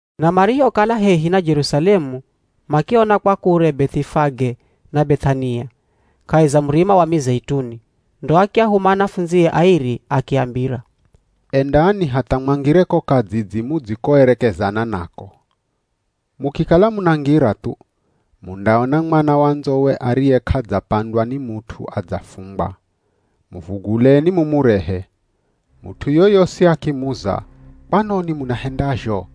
Na marihokala hehi na Jerusalemu makiona kwa kure Beth'ifage na Beth'ania, kahi za Murima wa Mizeituni, ndo akiahuma anafundzie airi akiambira, “Endani hatha mwangire ko kadzidzi mudzikoerekezana nako. Mukikala munangira thu, mundaona mwana wa ndzowe ariye k'adzapandwa ni mut'u adzafungwa. Muvuguleni mumurehe. Mut'u yoyosi akimuza, ‘Kwanoni munahendazho?’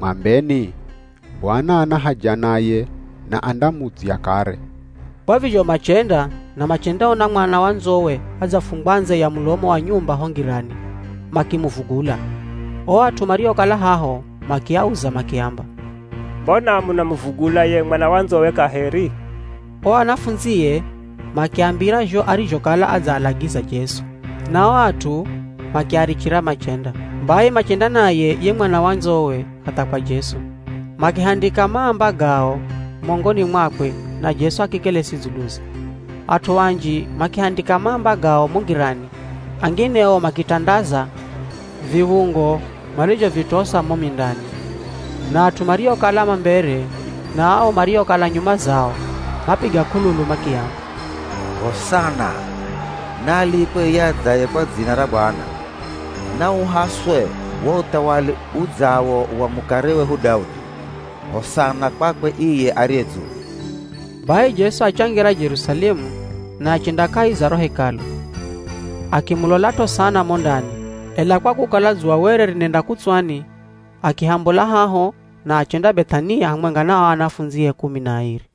mwambeni, ‘Bwana ana haja naye, na andamudzya kare.’” Kwa vizho machenda na machendaona mwana wa ndzowe adzafungwa ndze ya mulomo wa nyumba ho ngirani. Makimuvugula. O at'u mariokala haho makiauza makiamba, “Mbona munamuvugula ye mwana wa ndzowe kaheri?” O anafundzie makiambira zho arizhokala adzaalagiza Jesu, na o at'u makiarichira machenda. Bai machenda naye ye mwana wa ndzowe hatha kwa Jesu, makihandika maamba gao mongoni mwakwe na Jesu akikelesi dzuluze. At'u anji makihandika maamba gao mo ngirani, angine o makitandaza viv̱ungo marizhovitosa mo mindani. Na at'u mariokala ma mbere, na ao mariokala nyuma zao mapiga k'ululu makiamba, “Hosana! Naalikwe iye adzaye kwa dzina ra Bwana! Nauhaswe wo uthawali udzawo wa mukare wehu Daudi. Hosana kwakwe iye ariye dzulu!” Bai Jesu achangira Jerusalemu na achenda kahi za ro Hekalu, akimulolat'o sana mo ndani, ela kwa kukala dzuwa were rinenda kutswani, akihambola haho na achenda Beth'ania hamwenga na o anafundzie kumi na airi.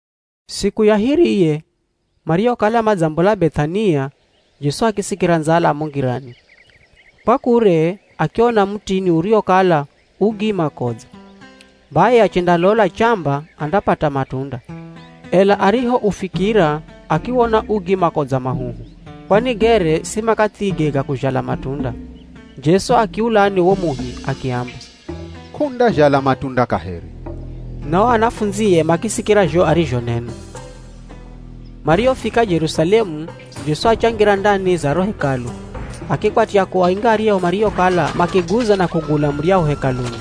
Siku ya hiriye, marihokala madzaombola Beth'ania, Jesu akisikira ndzala mo ngirani. Kwa kure akiona mutini uriwokala u gi makodza. Bai achendalola chamba andapata matunda. Ela arihoufikira akiwona u gi makodza mahuhu, kwani gere si makathige ga kuzhala matunda. Jesu akiulani wo muhi akiamba, “K'undazhala matunda kaheri.” Na o anafundzie makisikira zho arizhonena. Marihofika Jerusalemu, Jesu achangira ndani za ro Hekalu, akikwatya kuainga aryahu mariokala makiguza na kugula muryahu Hekaluni.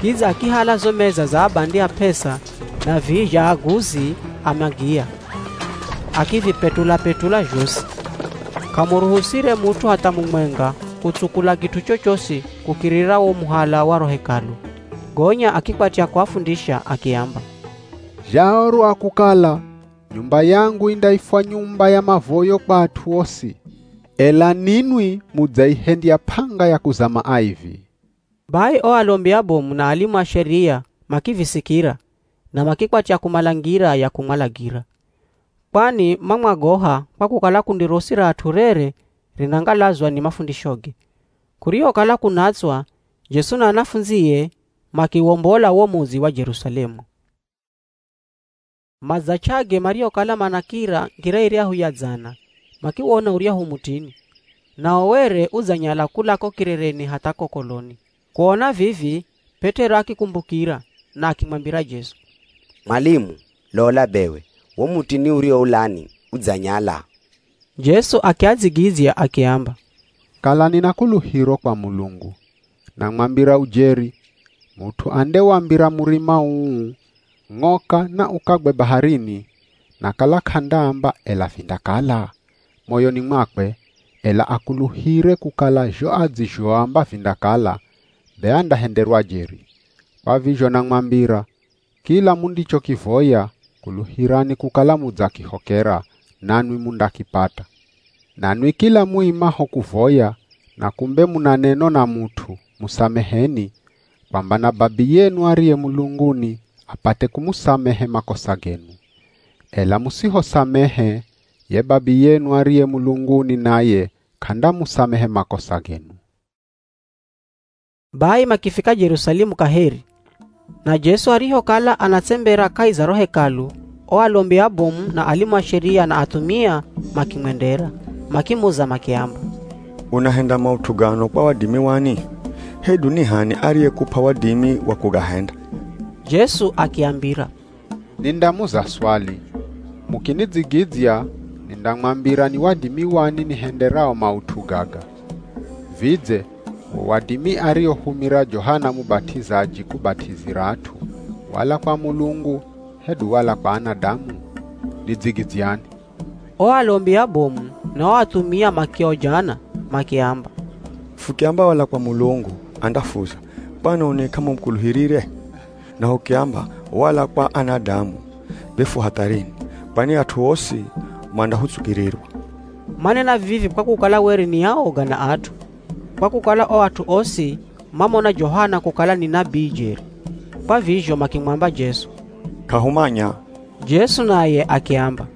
Kidza akihala zo meza za abandi a p'esa, na vihi zha aguzi a magiya, akivipetula-petula zhosi, k'amuruhusire mut'u hatha mumwenga kutsukula kit'u chochosi kukirira wo muhala wa ro Hekalu. Gonya akikwatya kuafundisha akiamba, “Zhaorwa kukala, ‘Nyumba yangu indaifwa nyumba ya mavoyo kwa at'u osi!’ Ela ninwi mudzaihendya p'anga ya kuzama aivi.” Bai o alombi abomu na alimu a Sheria makivisikira na makikwatya kumala ngira ya kumwalagira, kwani mamwagoha kwa kukala kundi rosi ra at'u rere rinangalazwa ni mafundishoge. Kurihokala kunatswa Jesu na anafundzie makiwombola wo mudzi wa Jerusalemu. Madzach'age marihokala manakira ngira iryahu ya dzana, makiwona uryahu mutini, nao were udzanyala kula ko kirereni hatha ko koloni. Kuona vivi P'et'ero akikumbukira, na akimwambira Jesu, “Mwalimu, lola bewe wo mutini uriwoulani udzanyala.” Jesu akiadzigidzya akiamba, “Kalani na kuluhiro kwa Mulungu. Namwambira ujeri, mut'u andewambira murima uu, ‘Ng'oka na ukagwe baharini,’ na kala k'andaamba, ‘Ela vindakala?’ moyoni mwakwe, ela akuluhire kukala zho adzizhoamba vindakala, be andahenderwa jeri. Kwa vizho namwambira, kila mundichokivoya, kuluhirani kukala mudzakihokera, nanwi mundakipata. Nanwi kila muimaho kuvoya, na kumbe muna neno na mut'u, musameheni, kwamba na Babiyenu ariye mulunguni apate kumusamehe makosa genu. [ Ela musihosamehe, ye Babiyenu ariye mulunguni naye k'andamusamehe makosa genu.”] Bai makifika Jerusalemu kaheri. Na Jesu arihokala anatsembera kahi za ro Hekalu, o alombi abomu, na alimu a Sheria na athumia makimwendera. Makimuza makiamba, “Unahenda maut'u gano kwa wadimi wani? Hedu ni h'ani ariyekup'a wadimi wa kugahenda?” Jesu akiambira, “Nindamuza swali. Mukinidzigidzya, nindamwambira ni wadimi wani nihenderao maut'u gaga. Vidze wo wadimi ariohumira Johana Mubat'izaji kubat'izira at'u, wala kwa Mulungu hedu wala kwa anadamu? Nidzigidzyani.” O alombi abomu na o athumia makiojana makiamba, “Fukiamba wala kwa Mulungu, andafuza, ‘Kwanoni k'amumukuluhirire?’ Na hukiamba, ‘Wala kwa anadamu,’ be fu hatharini, kwani at'u osi mandahutsukirirwa.” (Manena vivi kwa kukala were ni aoga na at'u, kwa kukala o at'u osi mamona Johana kukala ni nabii jeri.) Kwa vizho makimwamba Jesu, “K'ahumanya.” Jesu naye akiamba,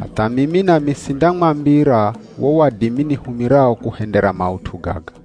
“Hatha mimi nami sindamwambira wo wadimi nihumirao kuhendera maut'u gaga.”